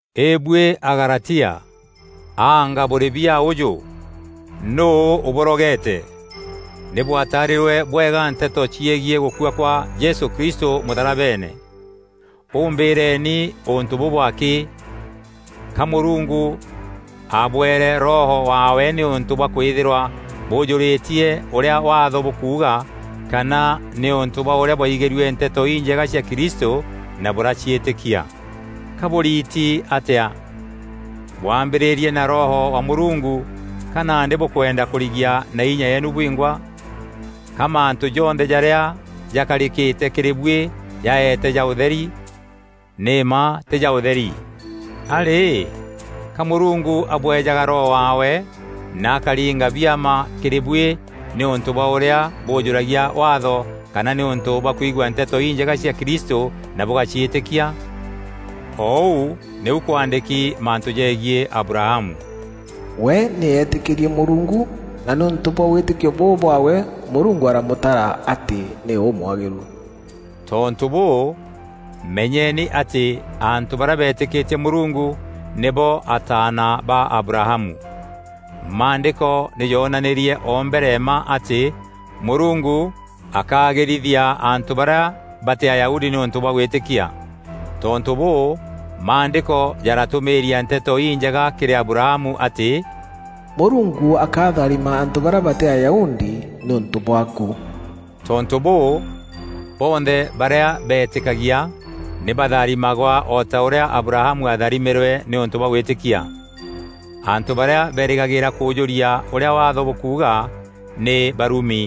Îbuî Agalatia, anga bûrî biaa ûjû! Nûû ûbûrogeete? Nî bwataarîrue bwega nteto ciegiî gûkua kwa Jesû Kristû mûtharabeene. Û mbîîreni ûntû bûbû akî: ka Mûrungu abwere Roho waawe nîûntû bwa kwîthîrwa bûûjûrîtie ûrîa Waatho bûkuuga kana nîûntû bwa ûrîa bwaigîrue Nteto Injega cia Kristû na bûraciîtîkia? Ka bûriiti atîa? Bwaambîrîîrie na Roho wa Mûrungu, ka nandî bûkwenda kûrigia na inya yeenu bwingwa? Ka mantû jonthe jarîa jakarîkîte kîrî buî jaeete ja ûtheri? Nî mma tî ja ûtheri! A rî, ka Mûrungu abweejaga Roho waawe na akaringa biama kîrî buî nîûntû bwa ûrîa bûûjûragia Waatho kana nîûntû bwa kwigua Nteto Injega cia Kristû na bûgaciîtîkia? O ûu nîu kwaandîki mantû jegiî Abrahamu, “We nî eetîkîrie Mûrungu, na nîûntû bwa wîtîkio bûu bwaawe Mûrungu aramûtara atî nî ûmwagîru.” Tontû bûû, menyeni atî antû barîa beetîkîtie Mûrungu, nîbo ataana ba Abrahamu. Maandîko nî joonanîrie o mbere mma atî Mûrungu akaagîrithia antû barîa batî Ayahudi nîûntû bwa gwîtîkia. Tontû bûû, Maandîko jaratûmîîria Nteto Injega kîrî Abrahamu atî: “Mûrungu akatharima antû barîa batî Ayahudi nîûntû bwaaku.” Tontû bûû, bonthe barîa beetîkagia nî batharimagwa o ta ûrîa Abrahamu atharimîrwe nîûntû bwa gwîtîkia. Antû barîa berîgagîîra kûûjûria ûrîa Waatho bûkuuga, nî barumi.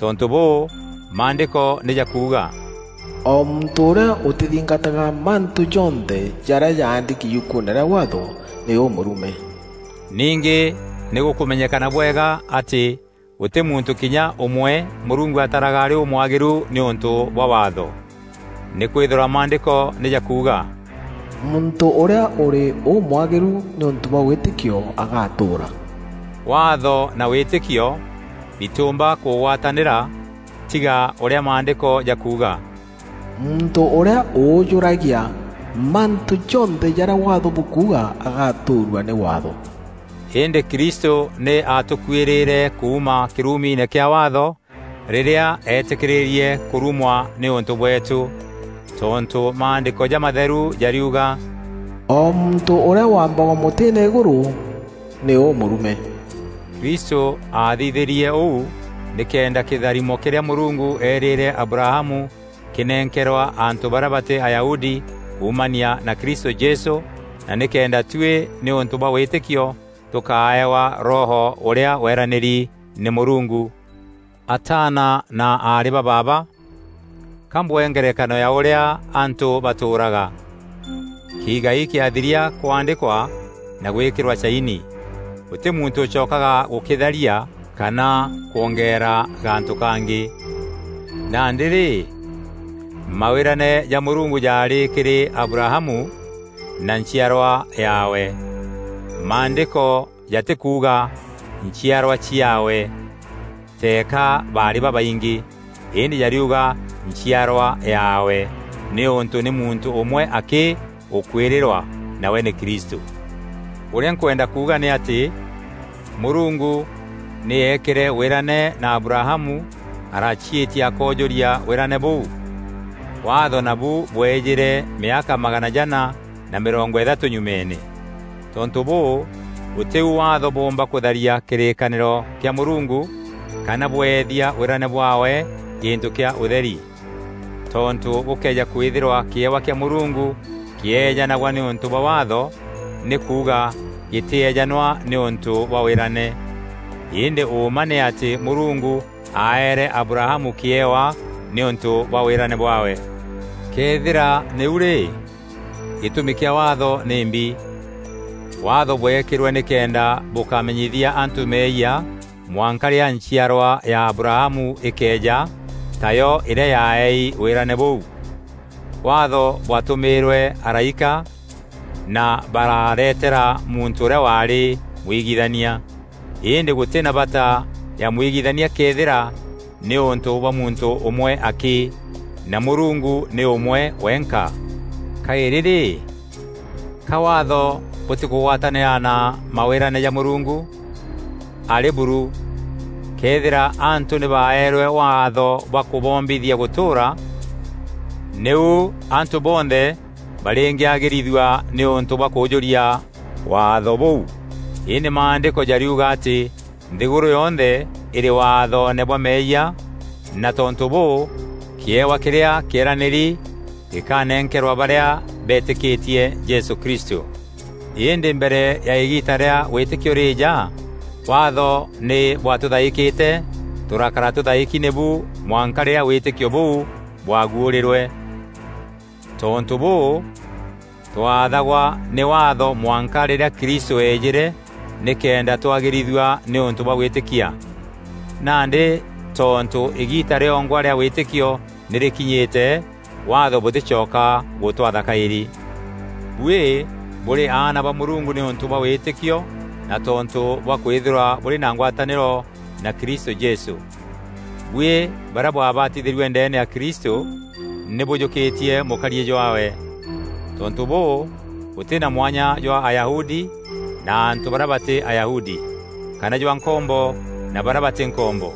Tontû bûû, Maandîko nî jakuuga, “O muntû ûrîa ûtîthingataga mantû jonthe jarîa jaandîki yukuune rîa Waatho, nî ûmûrume.” Ningî, nî gûkûmenyekana bwega atî gûtî muntû kinya ûmwe Mûrungu ataraga arî ûmwagîru nîûntû bwa Waatho. Nîkwîthîrwa Maandîko nî jakuuga, “Muntû ûrîa ûrî ûmwagîru nîûntû bwa wîtîkio agatûûra.” Waatho na wîtîkio bitîûmba kûgwatanîra tiga ûrîa Maandîko jakuuga, “Muntû ûrîa ûûjûragia mantû jonthe jarîa Waatho bûkuuga agatûûrua nî Waatho.” Îndî Kristû nî aatûkûûrîre kuuma kîrumiine kîa Waatho rîrîa eetîkîrîrie kûrumwa nîûntû bweetû. Tontû Maandîko Jamatheru jariuga, “O muntû ûrîa wambagwa mûtîîne îgûrû, nî ûmûrume.” Kristû aathithîrie ûu nîkenda kîtharimo kîrîa Mûrungu eerîîre Abrahamu kînenkerwa antû barîa batî Ayahudi kuumania na Kristû Jesû na nîkenda tuî nîûntû bwa wîtîkio tûkaeewa Roho ûrîa weranîri nî Mûrungu. Ataana na aarî ba baaba, ka mbwee ngerekano ya ûrîa antû batûûraga; kiigai kîathiria kwaandîkwa na gwîkîrwa caini, gûtî muntû ûcokaga gûkîtharia kana kwongeera gantû kangî. Nandî rî, mawîrane ja Mûrungu jaarî kîrî Abrahamu, na nchiarwa yaawe. Maandîko jatîkuuga, “Nchiarwa ciaawe,” teeka barî babaingî, îndî jariuga, “Nchiarwa yaawe,” nîûntû nî muntû ûmwe akî ûkwîrîrwa nawe nî Kristû. Ûrîa nkwenda kuuga nî atî: Mûrungu nî eekîre wîrane na Abrahamu araciîtia akoojûria wîrane bûu. Waatho nabu bwejîre mîaka magana jana na mîrongo îthatû nyumeene. Tontû bûû, gûtî u Waatho bûûmba kûtharia kîrîkanîro kîa Mûrungu kana bweethia wîrane bwaawe gîntû kîa ûtheri. Tontû gûkëeja kwîthîrwa kîewa kîa Mûrungu kîeejanagwa nîûntû bwa Waatho, nî kuuga, gîtîejanwa nîûntû bwa wîrane. Îndî ûûma nî atî Mûrungu aeere Abrahamu kîewa nîûntû bwa wîrane bwaawe. Këethîra nîu rî, gîtûmi kîa Waatho nîmbi? Waatho bweekîrwe nîkenda bûkamenyithia antû meeyia mwanka rîrîa nchiarwa ya Abrahamu îkeeja, tayo îrîa yaaeei wîrane bûu. Waatho bwatûmîîrwe araîka na bararetera muntû ûrîa waarî mwigithania. Îndî gûtî na bata ya mwigithania këethîra nîûntû bwa muntû ûmwe akî; na Mûrungu nî ûmwe wenka. Kaîrî rî, ka Waatho bûtîkûgwatanîra na mawîrane ja Mûrungu? Arî buru! Këethîra antû nî baeerwe waatho bwa kûboombithia gûtûûra, nîu antû bonthe barîngîagîrithua nîûntû bwa kûûjûria Waatho kûu. Îndî Maandîko jariuga atî nthîgûrû yonthe îrî waathoone bwa meeyia na tontû bûû, kîewa kîrîa kîeranîri gîkanenkerwa barîa betîkîtie Jesû Kristû. Îndî mbere ya îgiita rîa wîtîkio rîîja, Waatho nî bwatûthaîkîte, tûrakara tûthaîki nîbu mwanka rîrîa wîtîkio bûu bwaagwuûrîrwe. Tontû bûû, twaathagwa nî Waatho mwanka rîrîa Kristû eejîre nîkenda twagîrithua nîûntû bwa gwîtîkia. Nandî tontû îgiita rîongwa rîa wîtîkio nî rîkinyîte, Waatho bûtîcoka gûtwatha kaîrî. Buî bûrî aana ba Mûrungu nîûntû bwa wîtîkio na tontû bwa kwîthîrwa bûrî na ngwatanîro na Kristû Jesû. Buî barîa bwabatithîrue ndeene ya Kristû, nî bûjûkîtie mûkariî jwaawe. Tontû bûû, gûtî na mwanya jwa Ayahudi na antû barîa batî Ayahudi, kana jwa nkombo na barîa batî nkombo,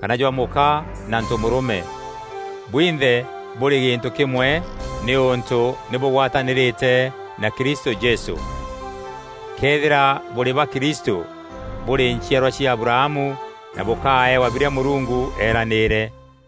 kana jwa mûka na ntomûrûme; bwinthe bûrî gîntû kîmwe nîûntû nî bûgwatanîrîte na Kristû Jesû. Këethîra bûrî ba Kristû, bûrî nchiarwa cia Abrahamu na bûkaeewa birîa Mûrungu eeranîîre.